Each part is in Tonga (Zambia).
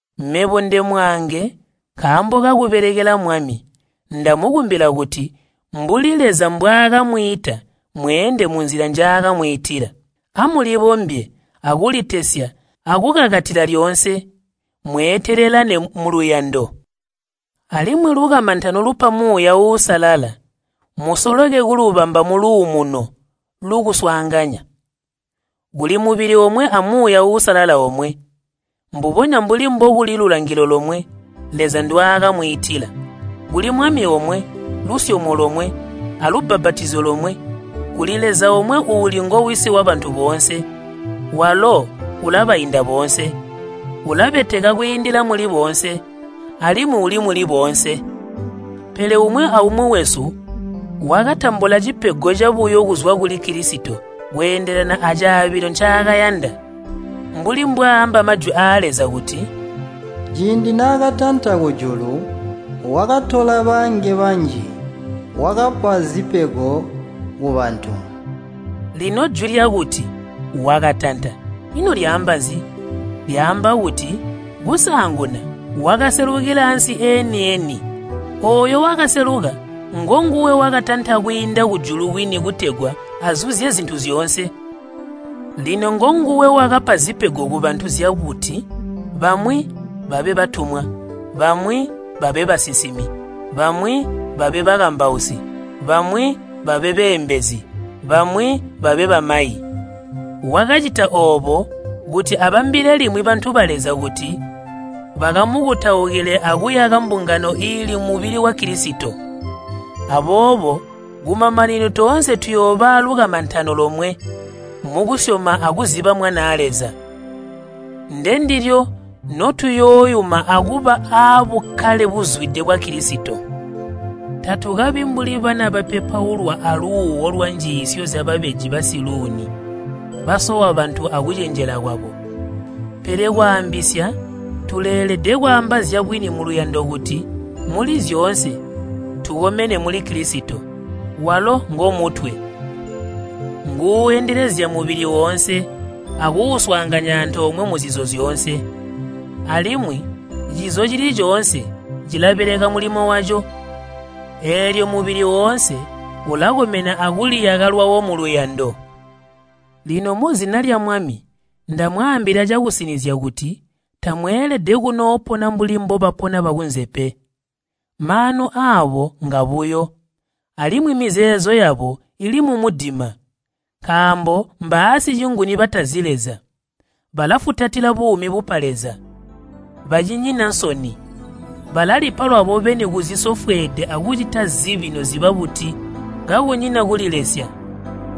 Mebo, ndemwaange nkaambo kakubelekela Mwami, ndamukumbila kuti mbuli Leza mbwaakamwiita mweende munzila njaakamwiitila. Amulibombye, akulitesya akukakatila lyoonse. Mweetelelane muluyando alimwi lukamantano lupa Muuya Uusalala, musoleke kulubamba muluumuno lukuswaanganya. Kuli mubili omwe a Muuya Uusalala omwe, mbubonya mbuli mbokuli lulangilo lomwe Leza ndwaakamwiitila. Kuli Mwami omwe, lusyomo lomwe, alubbapatizyo lomwe. Kuli Leza omwe uuli ngo Wisi wabantu boonse. Walo ulabainda boonse, ulabeteka kwiindila muli boonse, alimwi uli muli boonse. Pele umwi aumwi wesu wakatambula cipego cabuyo kuzwa kuli Kilisito kweendelana acaabilo ncaakayanda. Mbuli mbwaaamba Majwi aa Leza kuti, “Ciindi naakatanta kujulu, wakatola baange banji, wakapa zipego kubantu.” Lino jwi lyakuti, “Wakatanta,” ino lyaamba nzi? Lyaamba kuti kusaanguna wakaselukila ansi eeni-eni. Ooyo wakaseluka ngonguwe wakatanta kwiinda kujulu kwini kutegwa azuzye zintu zyoonse. Lino ngonguwe wakapa zipego kubantu zyakuti bamwi babe batumwa, bamwi babe basinsimi, bamwi babe bakambausi, bamwi babe beembezi, bamwi babe bamayi. Wakacita oobo kuti abambile limwi bantu ba Leza kuti bakamukutaukile akuyaka mbungano iili mubili wa Kilisito. Aboobo kumamanino toonse tuyooba aalukamantano lomwe mukusyoma akuziba Mwanaa Leza. Ndendilyo notuyooyuma akuba aabukkale buzwide bwa Kilisito. Tatukabi mbuli bana bapepaulwa aluuwo lwanjiisyo zyababeji basiluuni, basowa bantu akucenjela kwabo. Pele kwaambisya tuleelede kwaamba zyabwini muluyando kuti muli zyoonse tukomene muli Kilisito. Walo ngomutwe, nguuendelezya mubili woonse akuuswaanganya antoomwe muzizo zyoonse. Alimwi cizo cili coonse cilabeleka mulimo waco, eelyo mubili woonse ulakomena akuliyaka lwawo muluyando. Lino muzina lya Mwami ndamwaambila cakusinizya kuti tamweelede kunoopona mbuli mbobapona bakunze pe. Maanu aabo ngabuyo, alimwi mizeezo yabo ili mumudima. Nkaambo mbaasicinguni batazi Leza, balafutatila buumi bupa Leza. Bacinyina nsoni, balalipa lwabo beni kuzisofweede akucita zibi noziba buti kakunyina kulilesya.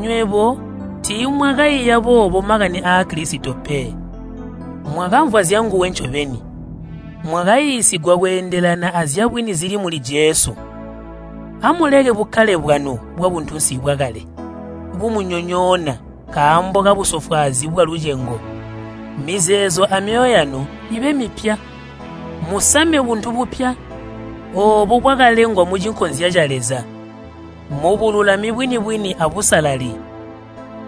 Nywebo tiimwakaiya boobo makani aa Kilisito pe! Mwakamvwa zyanguwe ncobeni, mwakaiisigwa kweendelana azyabwini zili muli Jesu. Amuleke bukkale bwanu bwabuntunsi bwakale, bumunyonyoona nkaambo kabusofwaazi bwalucengo. Mizeezo amyoyo yanu ibe mipya. Musame buntu bupya, oobo bwakalengwa mucinkozya ca Leza mubululami bwini-bwini abusalali.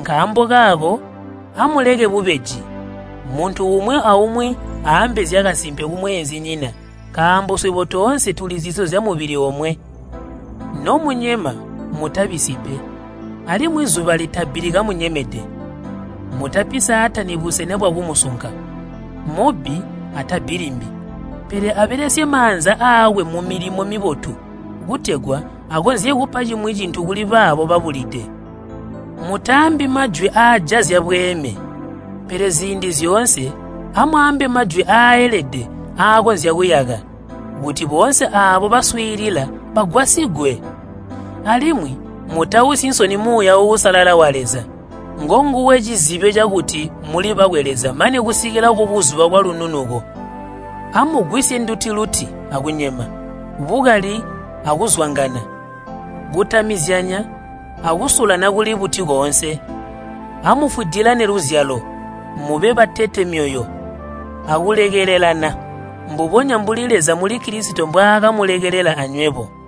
Nkaambo kaako, amuleke bubeji. Muntu umwi aumwi aambe zyakasimpe kumweenzinyina nkaambo swebo toonse tuli zizo zyamubili omwe. Nomunyema mutabisyi pe, alimwi zuba litabbili kamunyemede. Mutapi Saatani busena bwakumusunka. Mubbi atabbi limbi, pele abelesye maanza aakwe mumilimo mibotu, kutegwa akonzye kupa cimwi cintu kuli baabo babulide. Mutaambi majwi aajazya bweeme, pele ziindi zyoonse amwaambe majwi aaelede aakonzya kuyaka, kuti boonse aabo baswiilila bagwasigwe. Alimwi mutausyi nsoni Muuya Uusalala wa Leza, ngonguwe cizibyo cakuti muli bakwe Leza mane kusikila kubuzuba bwalununuko. Amugwisye nduti-luti akunyema, bukali akuzwangana, kutamizyanya akusulana kuli buti koonse. Amufwidilane luzyalo, mube batete myoyo akulekelelana, mbubonya mbuli Leza muli Kilisito mbwaakamulekelela anywebo.